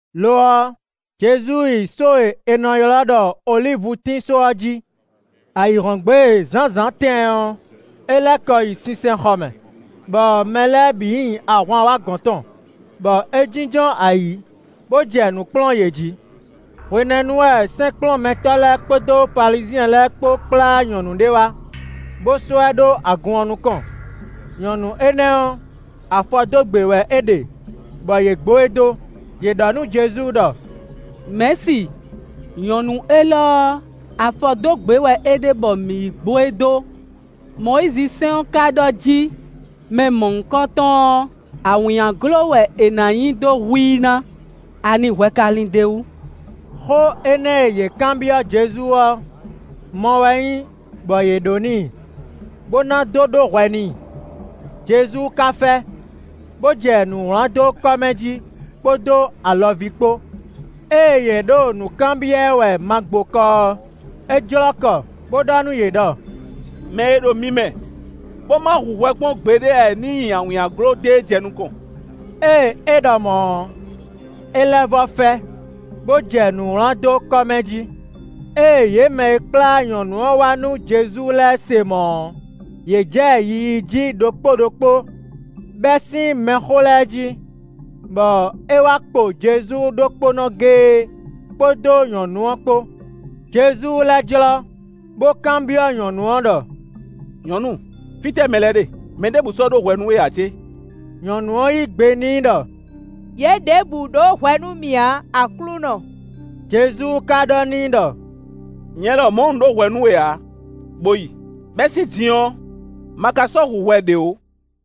Lo ɔ́, Jezu yi só e è nɔ ylɔ́ ɖɔ olívutín só ɔ́ jí. Ayǐhɔ́ngbe zǎnzǎn tɛɛn ɔ́, é lɛ́ kɔ yi sinsɛnxɔ mɛ, bɔ mɛ lɛ́ɛ bǐ nyi ahwan wá gɔ̌n tɔn, bɔ é jínjɔ́n ayǐ, bó jɛ nǔ kplɔ́n yě jí. Hwenɛ́nu wɛ sɛ́nkplɔ́nmɛtɔ́ lɛ́ɛ kpódó Falizyɛn lɛ́ɛ kpó kplá nyɔ̌nu ɖé wá, bó sɔ́ ɛ ɖó agun ɔ́ nukɔn; nyɔ̌nu énɛ́ ɔ́, afɔ dó gbě wɛ é ɖe bɔ yě gbo e dó. Yě ɖɔ nú Jezu ɖɔ: “Mɛ̌si, nyɔ̌nu élɔ́ ɔ́, afɔ dó gbě wɛ é ɖe bɔ mǐ yi gbo e dó. Mɔyízi sɛ́n ɔ́ ka ɖɔ jí mɛ mɔ̌hunkɔtɔn ɔ́, awǐnnyaglo wɛ è nǎ nyi dó hu i ná. Ani hwɛ ka lin d'é wú?” Xó énɛ́ e yě kanbyɔ́ Jezu ɔ́, mɔ wɛ nyí bɔ yě ɖó n'i, bo na dó ɖó hwɛ n'i. Jezu ka fɛ, bo jɛ nǔ wlán dó kɔ́ mɛ jí kpódó alɔví kpó. Ée yě ɖo nǔ kanbyɔ́ ɛ wɛ magbokɔ ɔ́, é jlɔ́ kɔ bó ɖɔ nú yě ɖɔ: “Mɛ e ɖo mi mɛ bó ma hu hwɛ kpɔ́n gbeɖé ǎ ɔ́ ní nyi awǐnnyaglo dó e jɛ nukɔn.” Ée é ɖɔ mɔ̌ ɔ́, é lɛ́ vɔ́ fɛ, bó jɛ nǔ wlán dó kɔ́ mɛ jí. Ée yě mɛ e kplá nyɔ̌nu ɔ́ wá nú Jezu lɛ́ɛ se mɔ̌ ɔ́, yě jɛ yiyi jí ɖokpó ɖokpó, bɛ́ sín mɛxó lɛ́ɛ jí, bɔ é wá kpo Jezu ɖokpónɔ géé kpódó nyɔ̌nu ɔ́ kpó. Jezu lɛ́ jlɔ́, bó kanbyɔ́ nyɔ̌nu ɔ́ ɖɔ: “Nyɔ̌nu! Fítɛ́ mɛ lɛ́ɛ ɖe? Mɛ ɖěbǔ sɔ́ ɖó hwɛ nú we ǎ cé?” Nyɔ̌nu ɔ́ yí gbe n'i ɖɔ: “Yě ɖěbǔ ɖó hwɛ nú mì ǎ, Aklúnɔ.” Jezu ka ɖɔ n'i ɖɔ: “Nyɛ lɔmɔ̌ un ɖó hwɛ nú we ǎ; bo yi; bɛ́ sín din ɔ́, ma ka sɔ́ hu hwɛ ɖě ó.”]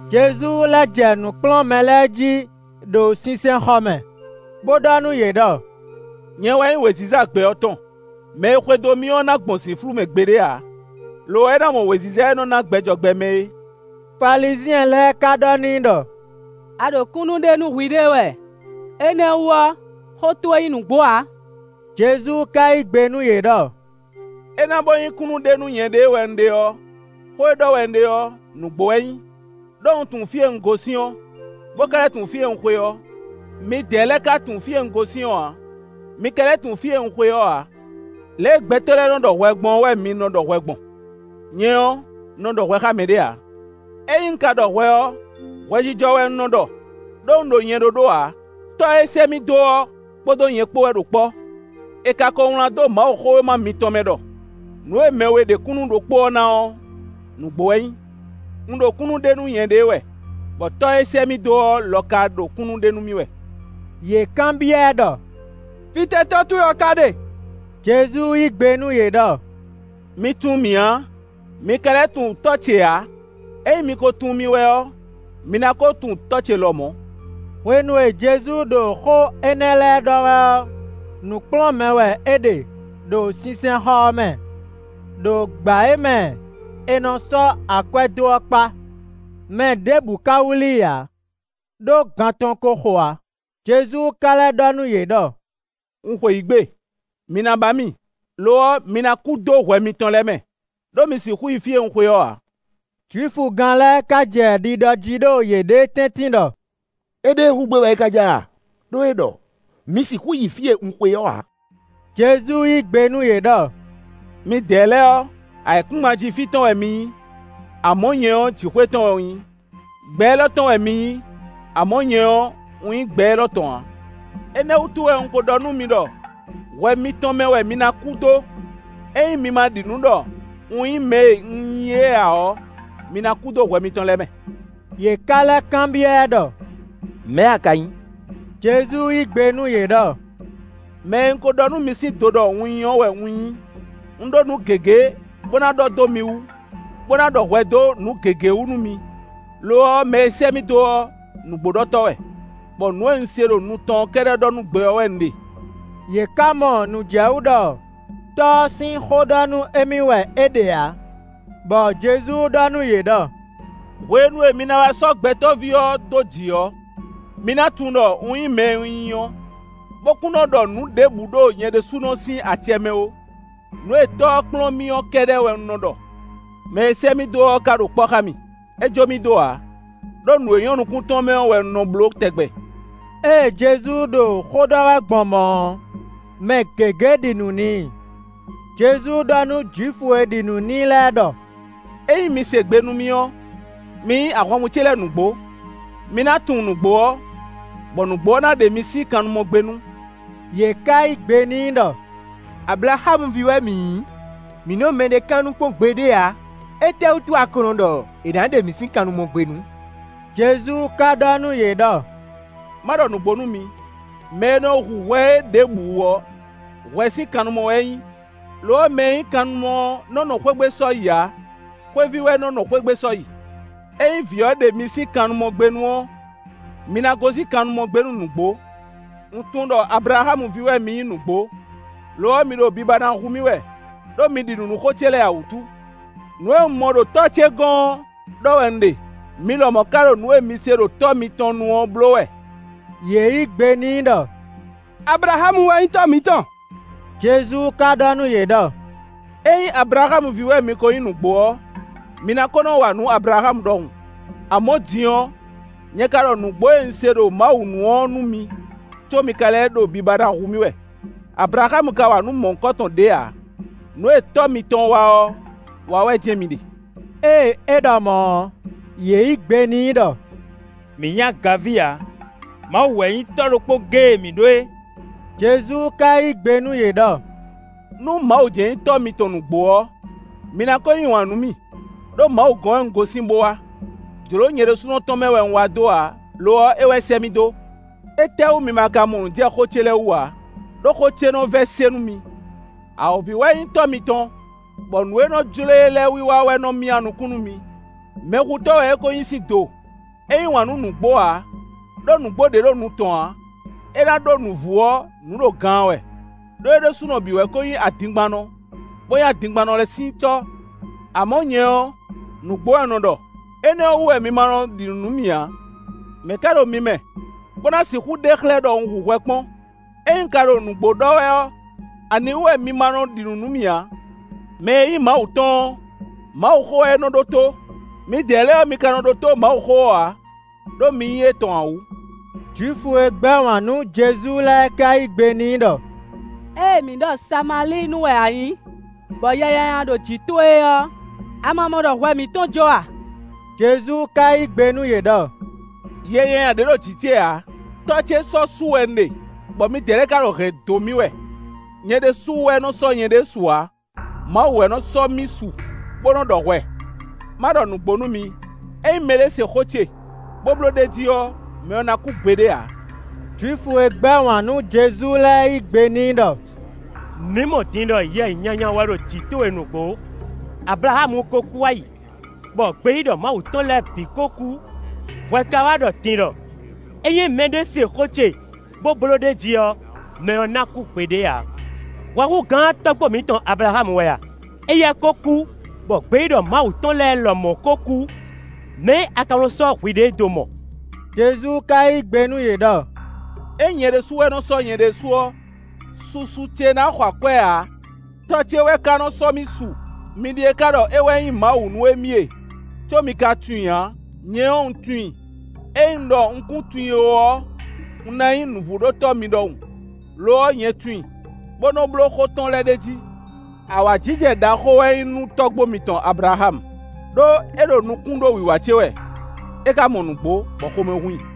Jezu lɛ́ jɛ nǔ kplɔ́n mɛ lɛ́ɛ jí ɖo sinsɛnxɔ mɛ, bo ɖɔ nú yě ɖɔ: “Nyɛ wɛ nyí wěziza gbɛ ɔ́ tɔn; mɛ e xwedó mì ɔ́ na gbɔn zǐnflú mɛ gbeɖé ǎ, lo ɔ́ é ná mɔ wěziza e nɔ ná gbɛ jɔ gbɛ mɛ é.” Falizyɛn lɛ́ɛ ka ɖɔ n'i ɖɔ: “A ɖo kúnnu ɖe nú hwiɖée wɛ; énɛ́ ɔ́ wú ɔ́, xó towe nyí nǔgbó ǎ.” Jezu ka yí gbe nú yě ɖɔ: “É ná bó nyí kúnnu ɖe nú nyɛɖée wɛ un ɖe ɔ́, xó e ɖɔ wɛ un ɖe ɔ́, nǔgbó wɛ é nyí; ɖó un tunwun fí e un gosín ɔ́, bo ka lɛ́ tunwun fí e un xwe ɔ́. Midɛɛ lɛ́ɛ ka tunwun fí e un gosín ɔ́ ǎ; mi ka lɛ́ tunwun fí e un xwe ɔ́ ǎ. Lě e gbɛtɔ́ lɛ́ɛ nɔ ɖɔ hwɛ gbɔn ɔ́ wɛ mi nɔ ɖɔ hwɛ gbɔn; nyɛ ɔ́, un nɔ ɖɔ hwɛ xá mɛɖé ǎ. Ényí un ka ɖɔ hwɛ ɔ́, hwɛjijɔ wɛ un nɔ ɖɔ; ɖó un ɖo nyɛ ɖóɖó ǎ; Tɔ́ e sɛ́ mì dó ɔ́ kpódó nyɛ kpó wɛ ɖo kpɔ́. È ka ko wlán dó Mawuxówéma mitɔn mɛ ɖɔ: ‘Nǔ e mɛ we ɖe kúnnu ɖokpó ɔ́ ná ɔ́, nǔgbó wɛ é nyí.’ Un ɖo kúnnu ɖe nú nyɛɖée wɛ, bɔ Tɔ́ e sɛ́ mì dó ɔ́ lɔ ka ɖo kúnnu ɖe nú mì wɛ.” Yě kanbyɔ́ ɛ ɖɔ: “Fítɛ́ Tɔ́ towe ɔ́ ká ɖe?” Jezu yí gbe nú yě ɖɔ: “Mi tunwun mì ǎ; mi ka lɛ́ tunwun Tɔ́ ce ǎ. Ényí mi ko tunwun mì wɛ ɔ́, mi ná ko tunwun Tɔ́ ce lɔmɔ̌.” Hwenu e Jezu ɖo xó énɛ́ lɛ́ɛ ɖɔ wɛ ɔ́, nǔ kplɔ́n mɛ wɛ é ɖe ɖo sinsɛnxɔ ɔ́ mɛ, ɖo gbǎ e mɛ è nɔ sɔ́ akwɛ́ dó ɔ́ kpá; mɛ ɖěbǔ ka wlí i ǎ, ɖó gan tɔn ko xo ǎ. Jezu ka lɛ́ ɖɔ nú yě ɖɔ: “Un xweyǐgbe; mi na ba mì, lo ɔ́, mi ná kú dó hwɛ mitɔn lɛ́ɛ mɛ, ɖó mi sixú yi fí e un xwe ɔ́ ǎ.” Jwifugán lɛ́ɛ ka jɛ ɖiɖɔ jí ɖo yěɖée tɛ́ntin ɖɔ: “Éɖée hu gbé wɛ é ka ja a? Đó é ɖɔ: ‘Mi sixú yi fí e un xwe ɔ́ ǎ.’” Jezu yí gbe nú yě ɖɔ: “Midɛɛ lɛ́ɛ ɔ́, ayǐkúngban jí fí tɔn wɛ mi nyí, amɔ̌, nyɛ ɔ́, jǐxwé tɔn wɛ un nyí: gbɛ élɔ́ tɔn wɛ mi nyí, amɔ̌, nyɛ ɔ́, un nyí gbɛ élɔ́ tɔn ǎ. Énɛ́ wútu wɛ un ko ɖɔ nú mi ɖɔ hwɛ mitɔn mɛ wɛ mi ná kú dó. Ényí mi ma ɖi nǔ ɖɔ un nyí mɛ e un nyí é ǎ ɔ́, mi ná kú dó hwɛ mitɔn lɛ́ɛ mɛ.” Yě ká lɛ́ kanbyɔ́ ɛ ɖɔ: “Mɛ̌ a ka nyí?” Jezu yí gbe nú yě ɖɔ: “Mɛ e un ko ɖɔ nú mi sín do ɖɔ un nyí ɔ́ wɛ un nyí. Un ɖó nǔ gěgé bó ná ɖɔ dó mi wú, bó ná ɖɔ hwɛ dó nǔ gěgé wú nú mi; lo ɔ́, mɛ e sɛ́ mì dó ɔ́, nǔgbóɖɔtɔ́ wɛ, bɔ nǔ e un se ɖo nu tɔn ɔ́ kɛ́ɖɛ́ ɖɔ nú gbɛ ɔ́ wɛ un ɖe.” Yě ká mɔ nǔ jɛ wú ɖɔ Tɔ́ ɔ́ sín xó ɖɔ nú émí wɛ é ɖe ǎ. Bɔ Jezu ɖɔ nú yě ɖɔ: “Hwenu e mi ná wá sɔ́ Gbɛtɔ́ví ɔ́ dó jǐ ɔ́, mi ná tunwun ɖɔ un nyí mɛ e un nyí ɔ́, bó kún nɔ́ ɖɔ nǔ ɖěbǔ ɖo nyɛ ɖésúnɔ sín acɛ mɛ ó; nǔ e Tɔ́ ɔ́ kplɔ́n mì ɔ́ kɛ́ɖɛ́ wɛ un nɔ ɖɔ. Mɛ e sɛ́ mì dó ɔ́ ka ɖo kpɔ́ xá mì; é jó mì dó ǎ, ɖó nǔ e nyɔ́ nukún tɔn mɛ ɔ́ wɛ un nɔ bló tɛgbɛ.” Ée Jezu ɖo xó ɖɔ wɛ gbɔn mɔ̌ ɔ́, mɛ gěgé ɖi nǔ n'i. Jezu ɖɔ nú Jwifu e ɖi nǔ n'i lɛ́ɛ ɖɔ: “Ényí mi se gbe nú mì ɔ́, mi nyí ahwanvú ce lɛ́ɛ nǔgbó. Mi ná tunwun nǔgbó ɔ́, bɔ nǔgbó ɔ́ ná ɖe mi sín kannumɔgbénu.” Yě ká yí gbe n'i ɖɔ: “Ablaxámu ví wɛ mǐ nyí, mǐ nɔ mɛɖé kannu kpɔ́n gbeɖé ǎ; étɛ́wútu a ka ɖɔ è nǎ ɖe mǐ sín kannumɔgbénu?” Jezu ka ɖɔ nú yě ɖɔ: “Má ɖɔ nǔgbó nú mi: mɛ e nɔ hu hwɛ é ɖěbǔ ɔ́, hwɛ sín kannumɔ wɛ é nyí; lo ɔ́, mɛ e nyí kannumɔ ɔ́ nɔ́ nɔ xwé gbe sɔ́yi ǎ; xwéví wɛ nɔ́ nɔ xwé gbe sɔ́yi. Ényí Vǐ ɔ́ ɖe mi sín kannumɔgbénu ɔ́, mi ná gosín kannumɔgbénu nǔgbó. Un tunwun ɖɔ Ablaxámu ví wɛ mi nyí nǔgbó; lo ɔ́, mi ɖo biba ná hu mì wɛ, ɖó mi ɖi nǔ nú xó ce lɛ́ɛ ǎ wútu. Nǔ e un mɔ ɖo Tɔ́ ce gɔ́n ɔ́ ɖɔ wɛ un ɖe; mi lɔmɔ̌ ka ɖo nǔ e mi se ɖo tɔ́ mitɔn nu ɔ́ bló wɛ.” Yě yǐ gbe n'i ɖɔ: “Ablaxámu wɛ nyí tɔ́ mǐtɔn.” Jezu ka ɖɔ nú yě ɖɔ: “Ényí Ablaxámu ví wɛ mi ko nyí nǔgbó ɔ́, mi ná ko nɔ wa nǔ Ablaxámu ɖɔhun. Amɔ̌, din ɔ́, nyɛ ka ɖɔ nǔgbó e un se ɖo Mawu nu ɔ́ nú mi; có mi ka lɛ́ ɖo biba na hu mì wɛ; Ablaxámu ka wa nǔ mɔ̌hunkɔtɔn ɖě ǎ. Nǔ e tɔ́ mitɔn wa ɔ́ wa wɛ jɛ́n mi ɖe.” Ée é ɖɔ mɔ̌ ɔ́, yě yǐ gbe n'i ɖɔ: “Mǐ nyí agaví ǎ; Mawu wɛ nyí Tɔ́ ɖokpó géé e mǐ ɖó é.” Jezu ka yí gbe nú yě ɖɔ: “Nú Mawu jɛ́n nyí Tɔ́ mitɔn nǔgbó ɔ́, mi na ko yí wǎn nú mì, ɖó Mawu gɔ́n wɛ un gosín bó wá. Jlǒ nyɛ ɖésúnɔ tɔn mɛ wɛ un wá dó ǎ; lo ɔ́, é wɛ sɛ́ mì dó. Étɛ́wú mi ma ka mɔ nǔ jɛ xó ce lɛ́ɛ wú ǎ? Đó xó ce nɔ vɛ́ se nú mi. Awǒvi wɛ nyí tɔ́ mitɔn, bɔ nǔ e nɔ jló e lɛ́ɛ wiwa wɛ nɔ myá nukún nú mi. Mɛhutɔ́ wɛ é ko nyí sín do, é yí wǎn nú nǔgbó ǎ, ɖó nǔgbó ɖě ɖo nu tɔn ǎ; é ná ɖó nǔvú ɔ́, nǔ ɖo gaan wɛ, ɖó é ɖésúnɔ bǐ wɛ ko nyí adingbannɔ, bo nyí adingbannɔ lɛ́ɛ sín tɔ́. Amɔ̌, nyɛ ɔ́, nǔgbó wɛ un nɔ ɖɔ; énɛ́ ɔ́ wú wɛ mi ma nɔ ɖi nǔ nú mì ǎ. Mɛ̌ ká ɖo mi mɛ, bó ná sixú ɖe xlɛ́ ɖɔ un hu hwɛ kpɔ́n? Ényí un ka ɖo nǔgbó ɖɔ wɛ ɔ́, aniwú wɛ mi ma nɔ ɖi nǔ nú mì ǎ? Mɛ e nyí Mawu tɔn ɔ́, Mawuxó wɛ é nɔ ɖótó; midɛɛ lɛ́ɛ ɔ́, mi ka nɔ ɖótó Mawuxó ɔ́ ǎ, ɖó mi nyí étɔn ǎ wú.” Jwifu e gbɛ́ wǎn nú Jezu lɛ́ɛ ka yí gbe n'i ɖɔ: “Ée mǐ ɖɔ Samalíinu wɛ a nyǐ, bɔ yɛ nyanya ɖo jǐ towe é ɔ́, a ma mɔ ɖɔ hwɛ mǐtɔn jɔ a?” Jezu ka yí gbe nú yě ɖɔ: “Yɛ nyanya ɖě ɖo jǐ ce ǎ; Tɔ́ ce sɔ́ su wɛ un ɖe, bɔ midɛɛ lɛ́ɛ ka ɖo hɛ̌n dó mì wɛ. Nyɛ ɖésú wɛ nɔ sɔ́ nyɛɖée su ǎ; Mawu wɛ nɔ sɔ́ mì su, bo nɔ ɖɔ hwɛ. Má ɖɔ nǔgbó nú mi: ényí mɛɖé se xó ce, bó bló ɖ'é jí ɔ́, mɛ ɔ́ ná kú gbeɖé ǎ.” Jwifu e gbɛ́ wǎn nú Jezu lɛ́ɛ yí gbe n'i ɖɔ: “Mǐ mɔ din ɖɔ yɛ nyanya wɛ ɖo jǐ towe nǔgbó; Ablaxámu ko kú wá yi, bɔ gbeyíɖɔ Mawu tɔn lɛ́ɛ bǐ ko kú, hwɛ ka wá ɖɔ din ɖɔ: ‘Ényí mɛɖé se xó ce bó bló ɖ'é jí ɔ́, mɛ ɔ́ ná kú gbeɖé ǎ.’ Hwɛ hú gǎn tɔ́gbó mǐtɔn Ablaxámu wɛ a? Éyɛ́ ko kú, bɔ gbeyíɖɔ Mawu tɔn lɛ́ɛ lɔmɔ̌ ko kú. Mɛ̌ a ka nɔ sɔ́ hwiɖée dó mɔ?” Jezu ka yí gbe nú yě ɖɔ: “Ényí nyɛ ɖésú wɛ nɔ sɔ́ nyɛɖée su ɔ́, susu ce na xɔ akwɛ́ ǎ. Tɔ́ ce wɛ ka nɔ sɔ́ mì su. Mi ɖíe ka ɖɔ é wɛ nyí Mawu nú émí e, có mi ka tunwun i ǎ; nyɛ ɔ́, un tunwun i. Ényí un ɖɔ un kún tunwun i ó ɔ́, un ná nyí nǔvúɖótɔ́ mi ɖɔhun. Lo ɔ́, nyɛ tunwun i, bó nɔ́ bló xó tɔn lɛ́ɛ ɖ'é jí. Awǎjijɛ ɖaxó wɛ nyí nú tɔ́gbó mitɔn Ablaxámu, ɖó é ɖo nukún ɖó wiwa ce wɛ; é ka mɔ nǔgbó, bɔ xomɛ hun i.”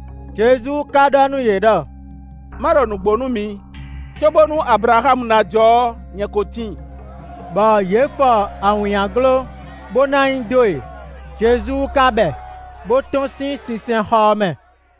Jezu ka ɖɔ nú yě ɖɔ: “Ma ɖɔ nǔgbó nú mi: cóbónú Ablaxámu ná jɔ ɔ́, nyɛ ko tíin.” Bɔ yě fɔ awǐnnyaglo, bó ná nyi dó e; Jezu ka bɛ, bó tɔ́n sín sinsɛnxɔ ɔ́ mɛ.